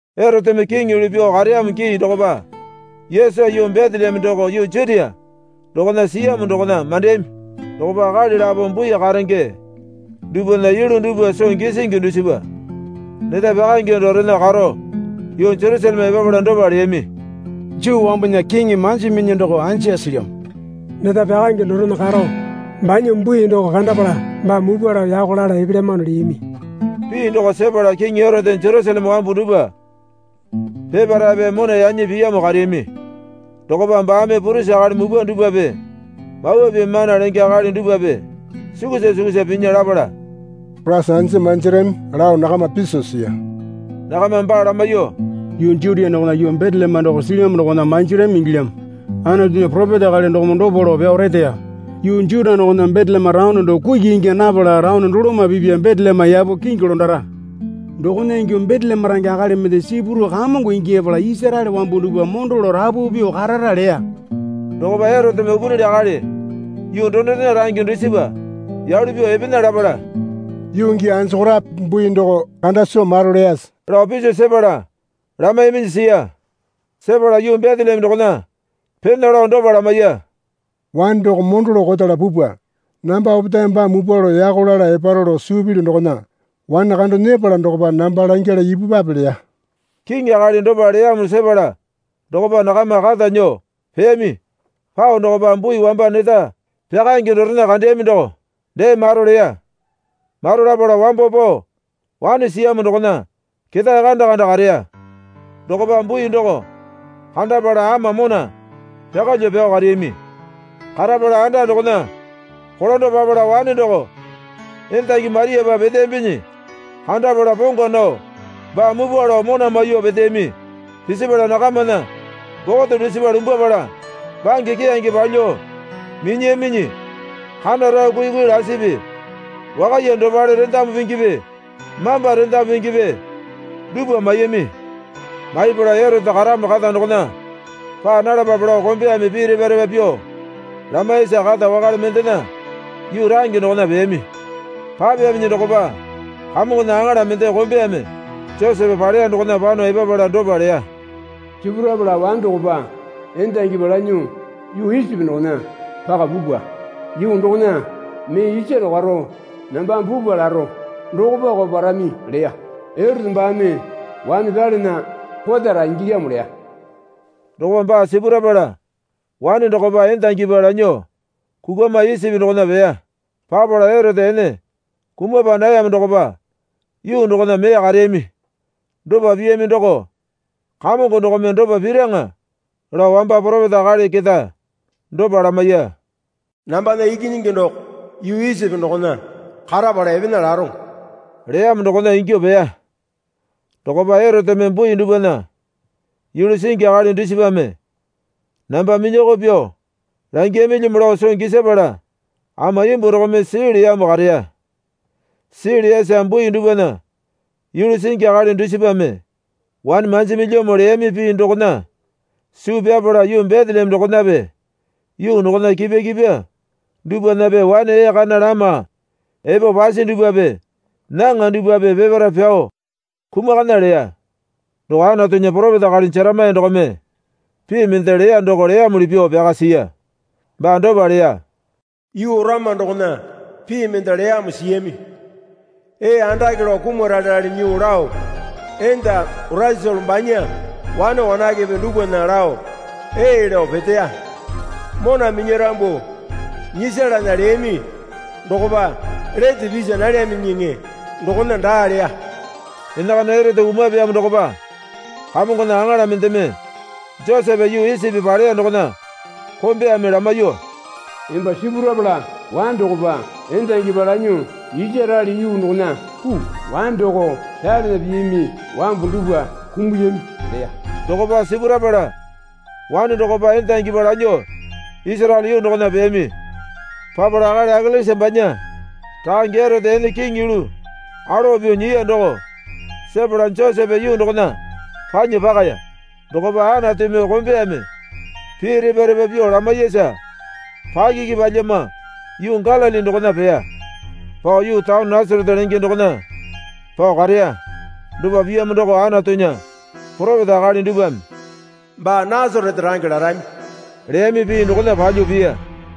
Eroteme kiŋi yulu pyuo kareyamo gii dokopa Yesu yuu Beteleme doko yuu Jutia dokona siyamo dokona mandeyami. Dokopa akali lapo bui karenge dupwana yulu dupwa soo gisingi dusipa neta pyakaenge dorena karo yuu Jerusaleme epapala dopa leyami. Juu wambunya kiŋi manjiminyi doko anja silyamo? Neta pyakaenge dorena karo banya bui doko kandapala baa mupwa lao yako lala epelyamano, leyami. Pii doko sepala kiŋi Erote Jerusaleme wambu dupwa peparaepe mona yanyi piyamo kareyami. Dokopa baame purisi akali mupwa dupwape, Mawa Pii mana lenge akali dupwape, sukusa sukusa pinya lapala, Koraisa anja manjarami, lao nakama piso siya. Nakamame baa lamaiyuo, Yuu Jutia dokona yuu Beteleme doko silyamo dokona manjarami ingilyamo. Anatunya poropeta akali dokome dopa lao pyao reteya. Yuu Juta dokona Beteleme taone doko kuki ingya napala taone doloma pipya Beteleme yapo kingi londara. Dokona ingyuo Beteleme range akali mende sipurao Kamongo ingyapala Isaraele wambu dupwa mondo lao rapu pyuo karara leya. Dokopa Eroteme upunili akali yuu donorena range dusipa yalu pyuo epena lapala, Yuu gii anjokorape bui doko kanda soo maro leyase? lao piso sepala lamaiyaminyi siya. Sepala yuu Beteleme dokona pena lao dopa lamaiya. Wane doko mondo lao kotala pupwa. Namba opetae baa mupwa lao yako lala eparo lao suu pilyu dokona wane kando nyepala dokopa namba langyala ipupwape leya. Kiŋi akali dopa leyamo sepala dokopa nakama kata nyuo peyami. Pao dokopa bui wamba neta pyakaenge dorena kandeyami doko dee maro leya. Maro lapala wambo pao wane siyamo dokona ketae kanda kanda kareya. Dokopa bui doko kandapala ama mona pyakalyuo pyao kareyami. Karapala anda dokona kolando papala wane doko endangi Mariapa peteyambinyi kandapala pongwa nao baa mupwa lao mona maiyuo peteyami. Pisipala nakamana bokote dusipa lumbwapala bange keyange palyuo minyiyaminyi kana rao kuikui lasipi wakaiya dopale rendamu pingipi mamba rendamu pingipi dupwa maiyami. Maipala, Erote karamo kata dokona paa nalapape lao kombeyame pii repa repa pyuo lamaiyasa kata wakale mendena yuu range dokona peyami. Papeyaminyi dokopa Kamongona aŋala mende kombeyame Josepe paleya dokona pano epapala dopa leya. Sipurapala wane dokopa endangipa lanyuo yuu Isipi dokona paka pupwa. Yuu dokona mee isaro karo nambame pupwa laro dokopako parami leya. Erote baame wane pyalana kotara ingilyamo leya. Dokopa baa sipurapala wane dokopa endangipa lanyuo kukwama Isipi dokona peya. Papala Erote ene kumapa nayamo dokopa yuu dokona mee kareyami. Dopa piyami doko Kamongo dokome dopa piraŋa lao wamba poropeta akali keta dopa lamaiya. Nambana ikinyingi doko yuu Isipi dokona karapala epena laroŋo, leyamo, dokona ingyuo peya. Dokopa Eroteme bui dupwana yulu singi akali dusipame namba minyoko pyuo langiyamilyamo lao soo gisapala ama imbuo dokome sii leyamo kareya. Sii leyasa bui dupwana yulu singi akali dusipame, wane manjimilyamo leyami pii dokona suu pyapala yuu Beteleme dokonape yuu dokona kipwa kipwa dupwanape wane ee kana lama epo pasi dupwape nyaŋa dupwape peparae pyao kumakana leya. Doko Anatunya poropeta akali Jeremaya dokome pii mende leya doko leyamuli pyuo pyaka siya. Baa dopa leya. Yuu Orama dokona pii mende leyamo siyami. Ee andake lao kumaralerale nyuo lao enda Oresolo banya wane wanakepe dupwana lao ee lao peteya. Mona minyarambu nyisalana leyami dokopa lete pisa nalyaminyiŋi dokona daa leya. Enakana Erote kumapeyamo dokopa Kamongona aŋala mendeme Josepe yuu Isipi paleya dokona kombeyame lamaiyuo, Emba sipurapala wane dokopa endangipa lanyuo Isaraele yuu dokona puu. Wane doko pyalana piyami wambu dupwa kumuyami, leya. Dokopa sipurapala wane dokopa endangipa lanyuo Isaraele yuu dokona peyami. Papala akali Akelesa banya rakange Erote ene kiŋi yulu alowa pyuo nyiya doko sepala Josepe yuu dokona panya pakaya. Dokopa Anatumi kombeyame pii repa repa pyuo lamaiyasa pakiki palyama yuu Galili dokona peya. Pao yuu taone Nasarete lenge dokona pao kareya. Dopa piyamo doko Anatunya poropeta akali dupwame, Baa Nasarete range larami, leyami pii dokona palyuo piya.